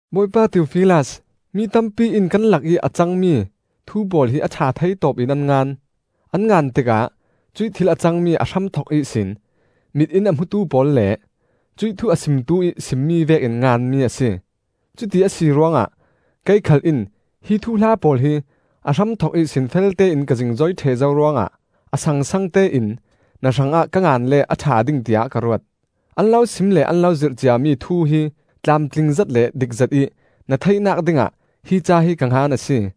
Bawipa Theofilas, Mi tampi in kan lakih a cangmi thu pawl hi a ṭha thei tawpin an ngan. An ngan tikah cuih thil a cangmi a hramthok ihsin mit in a hmutu pawl le cuih thu a simtu ih simmi vekin nganmi a si. Cuti a si ruangah kei khal in hi thuhla pawl hi a hramthok ihsin feltein ka zingzoi ṭheh zo ruangah a sangsangte in na hrangah ka ngan le a ṭha ding tiah ka ruat. An lo sim le an lo zirh ciami thu hi tlamtlingzet le dikzet ih na theihnak dingah hi ca hi ka ngan a si.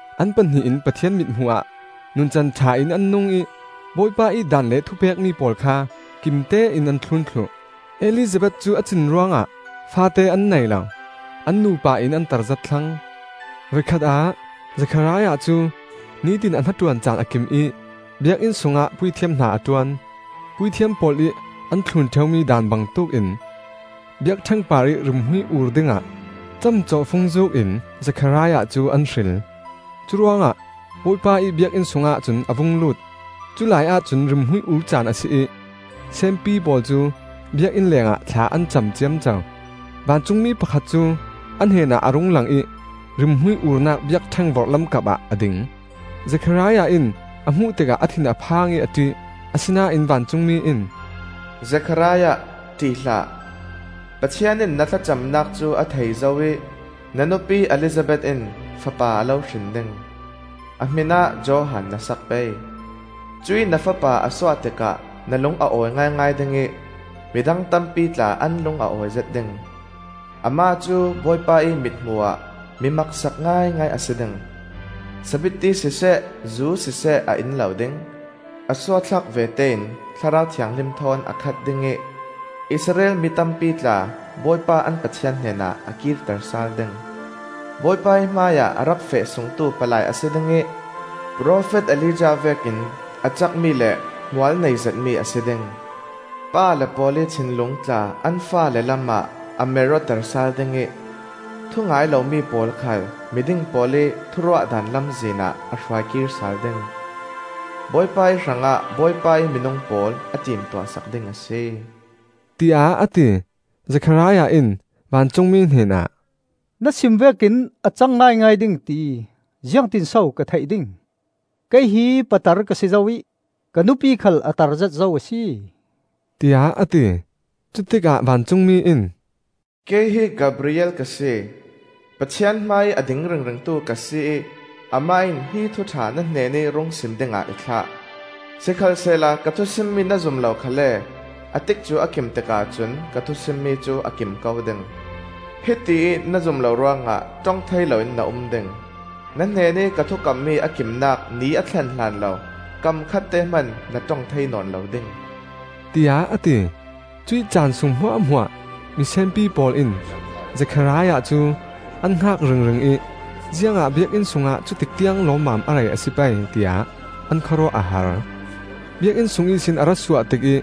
An pahnih in Pathian mithmuh ah nuncan ṭha in an nung ih Bawipa ih daan le thupekmi pawl kha kimtein an thlun thluh. Elizabeth cu a cin ruangah faate an nei lo; an nupa in an tarzet thlang. Voikhat ah Zekhariah cu nitin a hnaṭuan caan a kim ih Biakinn sungah puithiam hna a ṭuan. Puithiam pawl ih an thlun ṭheumi daan bangtuk in biakṭheng parih rimhmui ur dingah camcawhfung zuukin Zekhariah cu an hril. Curuangah Bawipa ih Biakinn sungah cun a vung lut. Culai ahcun rimhmui ur caan a si ih senpi pawl cu Biakinn lengah thla an cam ciamco. Vancungmi pakhat cu a hnenah a rung lang ih rimhmui urnak biakṭheng vorhlam kapah a ding. Zekhariah in a hmuh tikah a thin a phang ih a ṭih. Asinain vancungmi in, “Zekhariah, ṭih hlah! Pathian in na thlacamnak cu a thei zo ih na nupi Elizabeth in fapa a lo hrin ding. A hmin ah Johan na sak pei. Cuih na fapa a suah tikah na lung a awi ngaingai ding ih midang tampi tla an lung a awizet ding. Amah cu Bawipa ih mithmuh ah mi maksak ngaingai a si ding. Sabitti siseh, zu siseh a in lo ding. A suahthlak vete in Thlarau Thianghlim thawn a khat ding ih, Israel mi tampi tla Bawipa an Pathian hnenah a kirter sal ding. Bawipa ih hmaiah a rak feh sungtu palai a si ding ih profet Elijah vekin a cakmi le hmual nei zetmi a si ding. Pale pawl ih thinlung tla an faale lamah a mer awter sal ding ih thu-ngai lomi pawl khal miding pawl ih thuruahdan lamzin ah a hruai kir sal ding. Bawipa ih hrangah Bawipa ih minung pawl a timtuah sak ding a si,” tiah a ti. Zekhariah in vancungmi hnenah, “Na sim vek in a cang ngaingai ding ti ziangtinso ka theih ding? Kei hi patar ka si zo ih ka nupi khal a tarzet zo a si,” tiah a ti. Cutikah vancungmi in, “Kei hi Gabriel ka si. Pathian hmaiih a ding ringringtu ka si ih Amah in hi thuṭha na hnenih rung sim dingah i thlah. Sikhalsehla ka thu simmi na zum lo khalle a tikcu a kim tikah cun ka thu simmi cu a kim ko ding. Hitiih na zum lo ruangah ṭong thei loin na um ding. Na hnenih ka thukammi a kimnak ni a thlen hlan lo kam khatte hman na ṭong thei nawn lo ding,” tiah a ti. Cuih caan sung hmuahhmuah misenpi pawl in Zekhariah cu an hngak ringring ih ziangah Biakinn sungah cutik tiang lawmmam a rei a si pei tiah an khawruah a har. Biakinn sung ihsin a ra suah tikih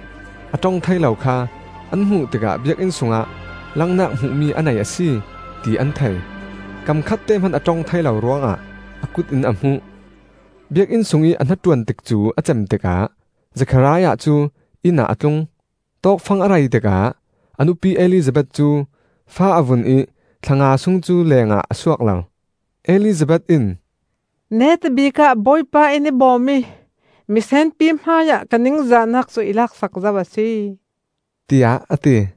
a ṭong thei lo kha an hmuh tikah Biakinn sungah langnak hmuhmi a nei a si, ti an thei. Kam khatte hman a ṭong thei lo ruangah a kut in a hmuh. Biakinn sungih a hnaṭuan tikcu a cem tikah Zekhariah cu inn ah a tlung. Tawkfang a rei tikah a nupi Elizabeth cu fa a vun ih thla nga sung cu lengah a suak lo. Elizabeth in, “Neta bikah Bawipa in i bawm ih misenpi hmaiah ka ningzahnak cu i laksak zo a si,” tiah a ti.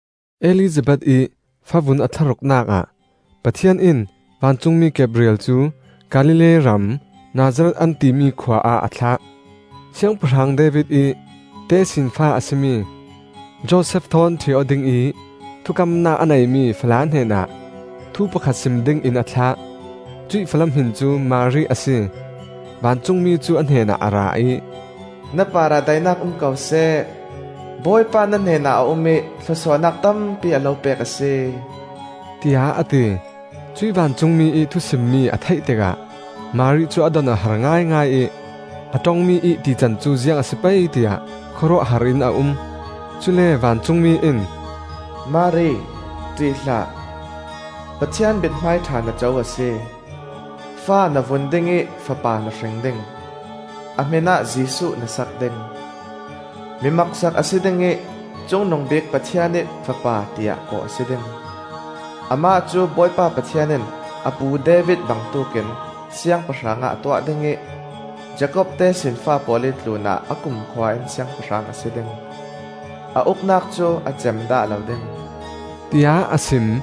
Elizabeth ih favun a thlaruknak ah Pathian in vancungmi Gabriel cu Galilee ram Nazareth an timi khua ah a thlah. Siangpahrang David ih tesinfa a si mi Josef thawn ṭhi aw dingih thukamnak a neimi fala hnenah thu pakhat sim dingin a thlah. Cuih fala hmin cu Mari a si. Vancungmi cu a hnenah a ra ih, “Na parah daihnak um ko seh! Bawipa na hnenah a um ih thlawsuahnak tampi a lo pek a si,” tiah a ti. Cuih vancungmi ih thusimmi a theih tikah Mari cu a don a har ngaingai ih a ṭongmi ih tican cu ziang a si pei tiah khawruahhar in a um. Cule vancungmi in, “Mari, ṭih hlah! Pathian mithmai ṭha na co a si. Fa na vun ding ih fapa na hring ding. A hmin ah Jesuh na sak ding. Mi maksak a si ding ih Cungnungbik Pathian ih Fapa tiah kawh a si ding. Amah cu Bawipa Pathian in a pu David bangtuk in siangpahrang ah a tuah ding ih, Jakob tesinfa pawl ih tlunah a kumkhua in siangpahrang a si ding. A uknak cu a cem dah lo ding,” tiah a sim.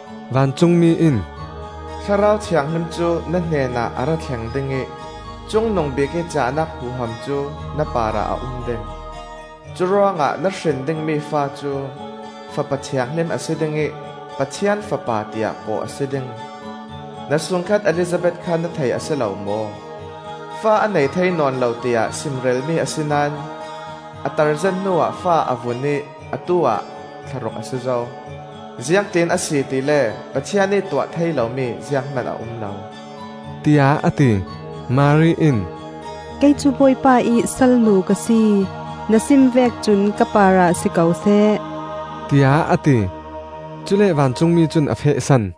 Vancungmi in, “Thlarau Thianghlim cu na hnenah a ra thleng ding ih Cungnungbik ih cahnak huham cu na parah a um ding. Curuangah na hrin dingmi fa cu fapa thianghlim a si ding ih Pathian Fapa tiah kawh a si ding. Na sungkhat Elizabeth kha na thei a si lo maw? Fa a nei thei nawn lo tiah simrelmi a si naón a tarzet hnuah fa a vun ih atu-ah thlaruk a si zo. Ziangtin a si tile Pathian ih tuah thei lomi zianghman a um lo,” tiah a ti. Mari in, “Kei cu Bawipa ih salnu ka si. Na sim vek cun ka parah si ko seh,” tiah a ti. Cule vancungmi cun a fehsan.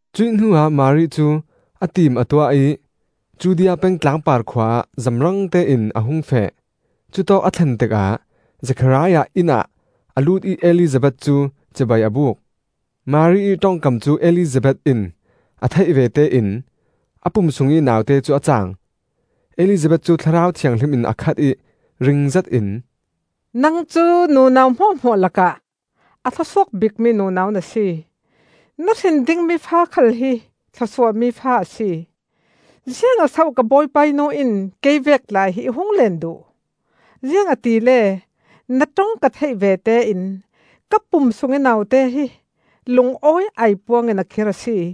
Cuih hnuah Mari cu a tim a tuah ih Judea peng tlangpar khua ah zamrangte in a hung feh. Cutawk a thlen tikah Zekhariah inn ah a lut ih Elizabeth cu cibai a buk. Mari ih ṭongkam cu Elizabeth in a theih vete in a pum sungih naute cu a caang. Elizabeth cu Thlarau Thianghlim in a khat ih, ringzet in, “Nang cu nunau hmuahhmuah lakah a thlawsuak bikmi nunau na si. Na hrin dingmi fa khal hi thlawsuahmi fa a si! Ziangah so ka Bawipa ih nu in kei vek tla hi i hung leen duh? Ziangahtile na ṭong ka theih vete in ka pum sungih naute hi lungawi aipuang in a khir a si.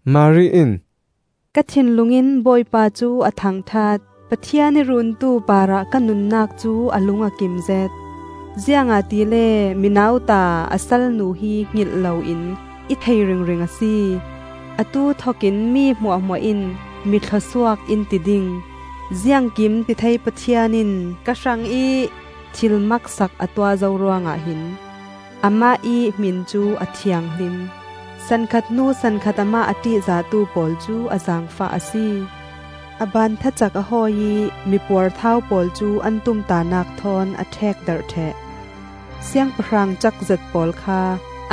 Mari in, “Ka thinlung in Bawipa cu a thangṭhat; Pathian i Runtu parah ka nunnak cu a lung a kimzet; Ziangahtile mi nauta a salnu hi hngilh loin i thei ringring a si. Atu thokin mi hmuahhmuah in mi thluasuak in ti ding, Ziangkimtithei Pathian in ka hrangih thil maksak a tuah zo ruangah hin. Amah ih hmin cu a thianghlim, Sankhat hnu sankhat amah a a ṭihzahtu pawl cu a zaangfah a si. A baan thacak a hawi ih mi puarthau pawl cu an tumtahnak thawn a ṭhekdarh ṭheh. Siangpahrang cakzet pawl kha,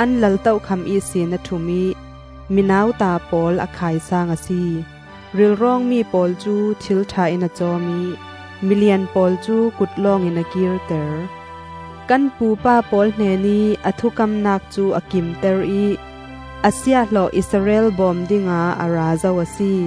an lal tokham ihsin a ṭhum ih, mi nauta pawl a khaisaang a si. Rilrawngmi pawl cu thil ṭha in a cawm ih, milian pawl cu kut lawngin a kirter. Kan pupa pawl hnenih a thukamnak cu a kimter ih, a siahhlawh Israel bawm dingah a ra zo a si.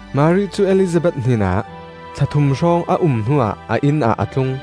Mari cu Elizabeth hnenah thla thum hrawng a um hnuah a inn ah a tlung.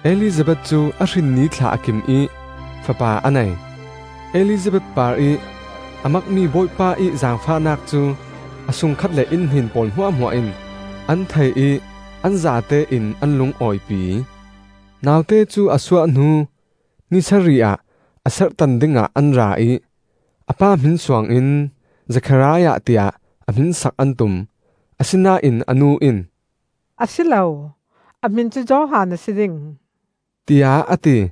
Elizabeth cu a hrin nithla a kim ih fapa a nei. Elizabeth parih a makmi Bawipa ih zaangfahnak cu a sungkhat le innhnen pawl hmuahhmuah in an thei ih an zatein an lungawipi. Naute cu a suah hnu ni sarih ah a serhtan dingah an ra ih a pa hmin suangin Zekhariah tiah a hmin sak an tum. Asinain a nu in, “A si lo, a hmin cu Johan a si ding,” tiah a ti.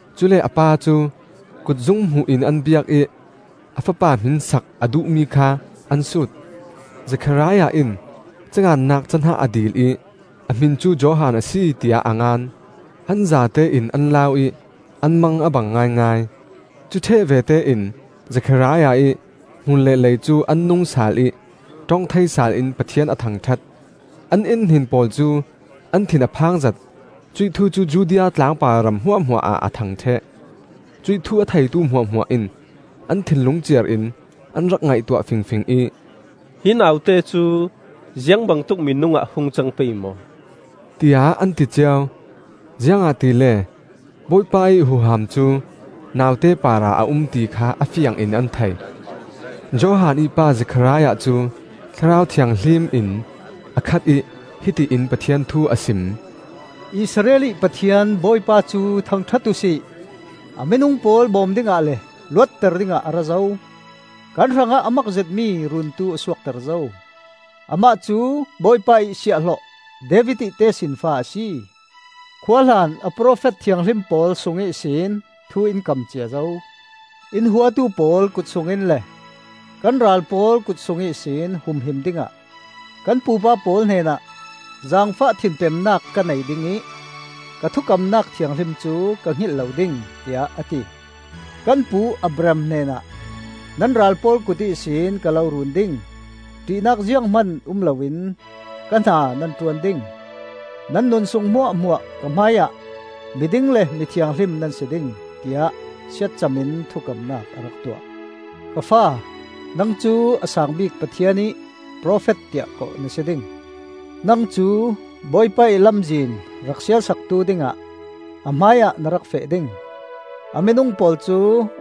Cule a pa cu kutzung hmuh in an biak ih a fapa hmin sak a duhmi kha an sut. Zekhariah in ca ngannak cahnah a dil ih, “A hmin cu Johan a si,” tiah a ngan. An zatein an lau ih an mang a bang ngaingai. Cu ṭheh vete in Zekhariah ih hmur le lei cu an nung sal ih ṭong thei sal in Pathian a thangṭhat. An innhnen pawl cu an thin a phang zet; cuih thu cu Judea tlangpar ram hmuahhmuah ah a thang ṭheh. Cuih thu a theitu hmuahhmuah in an thinlung ciar in an rak ngaihtuah fingfing ih, “Hi naute cu ziangbangtuk minung ah hung cang pei maw!” tiah an ti cio. Ziangahtile Bawipa ih huham cu naute parah a um ti kha a fiangin an thei. Johan ih pa Zekhariah cu Thlarau Thianghlim in a khat ih hiti in Pathian thu a sim: “Israel ih Pathian Bawipa cu thangṭhat uhsi; A minung pawl bawm dingah le, luatter dingah a ra zo. Kan hrangah a mak zetmi Runtu a suakter zo; Amah cu Bawipa ih siahhlawh David ih tesinfa a si. Khuahlan a profet thianghlim pawl sung ihsin thu in kam cia zo; In huatu pawl kut sungin le kan ral pawl kut sung ihsin humhim dingah. Kan pupa pawl hnenah ‘Zaangfah thinpemnak ka nei ding ih, ka thukamnak thianghlim cu ka hngilh lo ding,’ tiah a ti. Kan pu Abraham hnenah, ‘Nan ral pawl kut ihsin ka lo run ding; ṭihnak zianghman um loin ka hna nan ṭuan ding; Nan nunsung hmuahhmuah ka hmaiah mi ding le Mi thianghlim nan si ding,’ tiah siatcam in thukamnak a rak tuah. “Ka fa, nang cu a saang bik Pathian ih profet tiah kawh na si ding. Nang cu Bawipa ih lamzin rak sial saktu dingah a hmaiah na rak feh ding; A minung pawl cu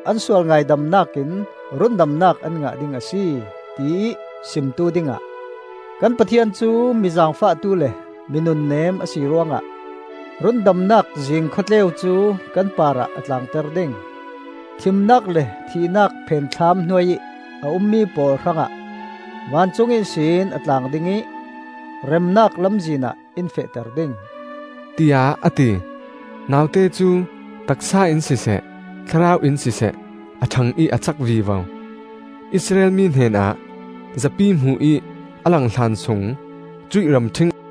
an sual ngaidamnak in rundamnak an ngah ding a si, tiih simtu dingah. Kan Pathian cu mi zaangfahtu le mi nunnem a si ruangah, Rundamnak zing khawtleu cu kan parah a tlaangter ding; Thimnak le thihnak phenthlam hnuai ih a ummi pawl hrangah Vancung ihsin a tlaang ding ih, remnak lamzinah in fehter ding,” tiah a ti. Naute cu taksa in siseh thlarau in siseh a ṭhang ih a cak vivo. Israel mi hnenah zapi hmuh ih a lang hlansung cuih ramṭhing ahcun a um.